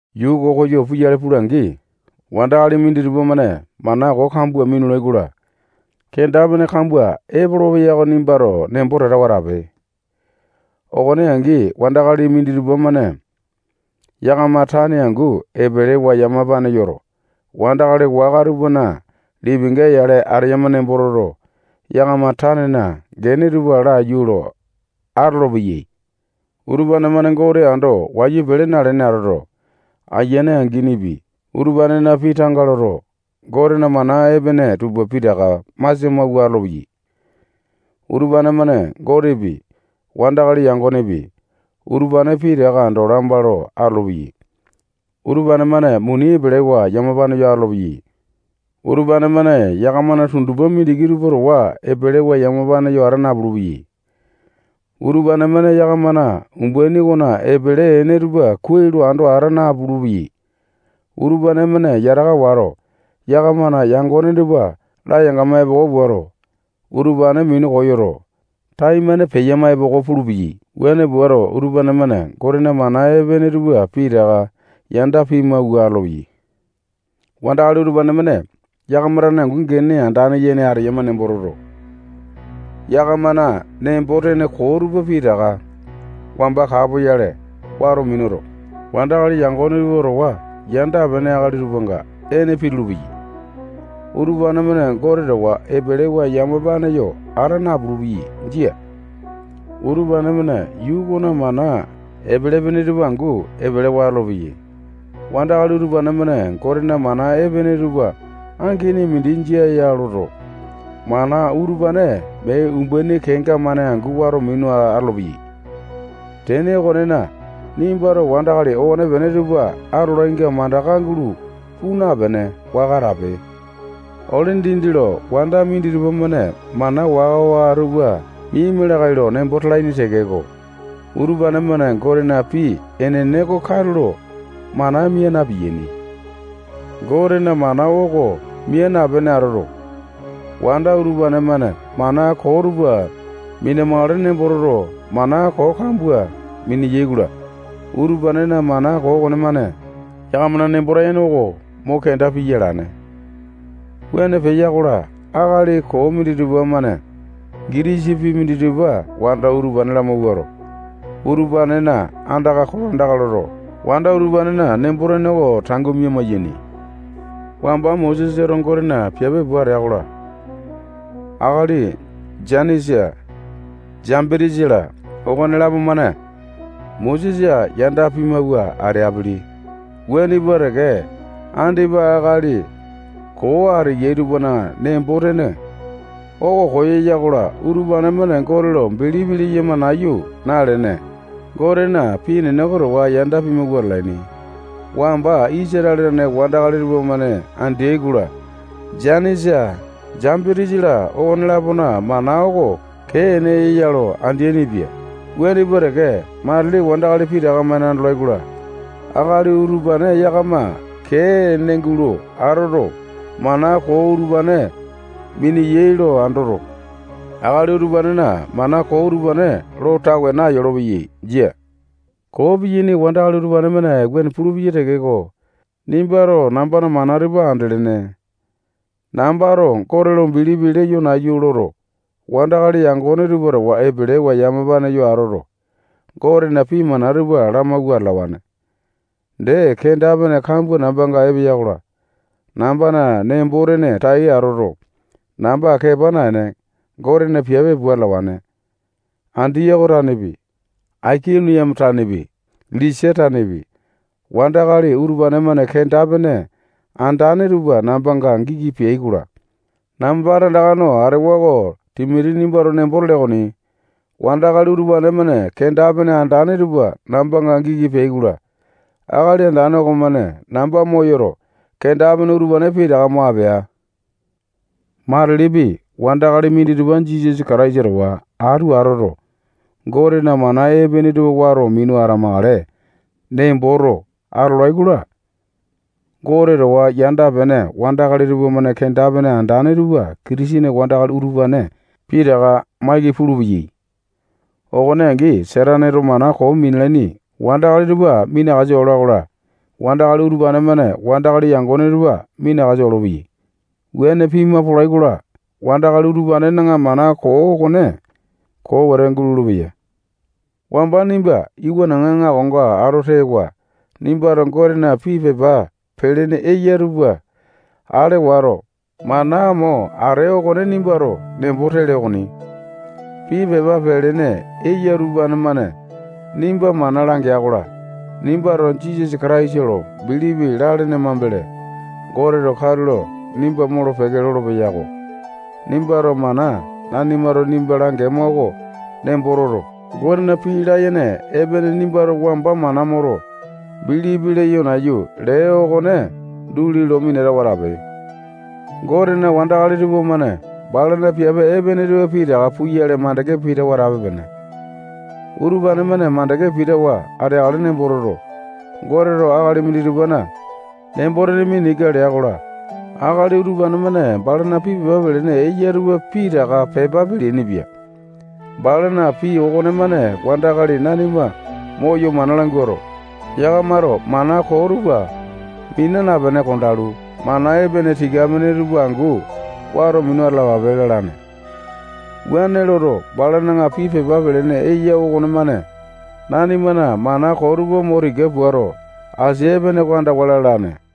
Yuu oko koyo puyale pula-angi, wandakali minditupa-mane mana koo kambua minulai-kola, kenda-pene kambua epolopeya oko nimbato nembo tatawa atape. Okone angi, wandakali minditupa-mane yakama tane angu epelewa yamapane yoto, wandakali waka tupana lipinga yale ateyama nembo toto, yakama tanena gene tupa laiyu lo atolopeya. Utupane-mane Gote ando wayu pele nalene atoto, ayiane anginipi, utupanena pii tanga loto, Gotena mana epene tupa pitaka masia mawua atolopeyai. Utupane-mane Gotepi, wandakali yangonepi, utupane pitaka ando lamba lo atolopeyai. Utupane-mane muni epelewa yamapane yo atolopeyai. Utupane-mane yakamana tundupa mindiki tupa towa epelewa yamapane yo ata napulu-peyai. Utupane-mane yakamana umbaini okona epele ene tupa kuai lo ando ata napulu-peyai. Utupane-mane yataka wato, yakamana yangone tupa layangama epoko puato, utupane minu koyoto, taimane peyama epoko pulupeyai. Wuane puato, utupane-mane Gotena mana epene tupa pitaka yanda pimawua atolopeyai. Wandakali utupane-mane yakama tane angu gene andane yene ateyama nembo toto, yakamana nembo-tene koo tupa pitaka wamba kapoyale wato minuto, wandakali yangone tupa towa yanda-pene akali tupanga ene pitulu-peyai. Utupane-mane Gote towa epelewa yamapane yo ata napulu-peyai. Jia. Utupane-mane yuu okona mana epele-pene tupa angu epelewa atolopeyai. Wandakali utupane-mane Gotena mana epene tupa angini mindi jia ya loto, mana utupane mee umbaini kenga-mane angu wato minu atolopeyai. Tene okonena, nimbato wandakali okonepene tupa atolainga mandaka gulo puu napene, waka atape. Ole dindi lo wanda minditupa-mane mana waka-waka tupa miaima lakae lo nembo talaini tekeko, utupane-mane Gotena pii enene oko katulo mana mia na-piyaini. Gotena mana oko mia napene atoto, wanda utupane-mane mana koo tupa mina-makale nembo toto, mana koo kambua miniyai-kola, utupanena mana koo okonemane yakamana nembo-tene oko mo kenda piya alane. Wuane peya-kola, akali koo minditupa-mane gitisa pii minditupa wanda utupane lamawuato, utupanena andaka kolandaka loto, wanda utupanena nembo-tene oko tangu mia-maiyane. Wamba Mosesato Gotena piape pua atea-kola, akali Janisa, Jambitisa-la, okonelapo-mane Mosesa yanda pimawua ateaini. Wuane pua teke, andipa akali koo ateyai tupana nembo-tene oko koyeya-kola, utupane-mane Gote lo bilipi leyama nayu nalene, Gotena pii enene oko towa yanda pimawua atalaini. Wamba Isatale tane wandakali tupamane andeai-kola, Janisa, Jambitisa-la, okone-lapona mana oko kee ene ya lo andeaini-pia. Wuane pua teke, matili wandakali pitaka-mane andolai-kola, akali utupane yakama kee ene gulo atoto, mana koo utupane mineyai lo andoto, akali utupanena mana koo utupane lo tawe nayolopeya. Jia. Koo piyaini wandakali utupane-mane wuane pulupeyai tekeko, nimbato nambana mana tupa andelene. Nambato Gote lo bilipi leyo nayu loto, wandakali yangone tupa towa epelewa yamapane yo atoto, Gotena pii mana tupa lamawua atalawane. Dee, kenda-pene kambua nambanga epeya-kola, nambana nembo-tene tai atoto, namba kepa naene, Gotena piape pua atalawane. Andiyoko tanepi, Aikoniame tanepi, Lisata tanepi, wandakali utupane-mane kenda-pene andane tupa nambanga giki peai-kola, namba tandaka no atewa oko Timoti nimbato nembo tele okoni. Wandakali utupane-mane kenda-pene andane tupa nambanga giki peai-kola, Akali Andane okomane namba moyoto, kenda-pene utupane pitaka mo apea. Matilipi wandakali minditupa Jisasa Kataisa towa atu atoto, Gotena mana epene tupa wato minu atamakale nemboto atolai-kola, Gote towa yanda-pene wandakali tupamane kenda-pene andane tupa Kitisene wandakali utupane pitaka maiki pulupeyai. Okone angi, Sataneto mana koo minalaini wandakali tupa minakasa ola-kola, wandakali utupane-mane wandakali yangone tupa minakasa olopeyai. Wuane pima polai-kola, wandakali utupanena mana koo okone koo wete gulolo-peya. Wamba nimba iwanaŋa aŋakonga ato tewa, nimbato Gotena pii pepa pelene eya tupa ale wato, mana mo atee okone nimbato nembo tele okoni. Pii pepa pelene eya utupane-mane nimba mana langeya-kola, nimbato Jisasa Kataisa lo bilipi lalene mambele, Goteto katulo nimba molo-peke lolopeya-ko. Nimbato mana nanimato nimba langema oko nembo toto, Gotena pii layene epene nimbato wamba mana moto, bilipi leyo nayu lee okone duli lo minatawa atape. Gotena wandakali tupamane balana piape epene tupa pitaka puyale makande pitawa atape-pene. Utupane-mane makande pitawa ateakale nembo toto, Goteto akali minditupana nembo-tene mina ika lea-kola, akali utupane-mane balana pii pepa pelene eya tupa pitaka pepa peleaini-pia. Balana pii okonemane wandakali nanima moyo mana languato, yakamato mana koo tupa mina napene kondalu, mana epene tika-pene tupa angu wato minu atalapape lalane. Wuane loto, balana pii pepa pelene eya okonemane nanimana mana koo tupa mo tika puato, asia epene oko andawa lalane.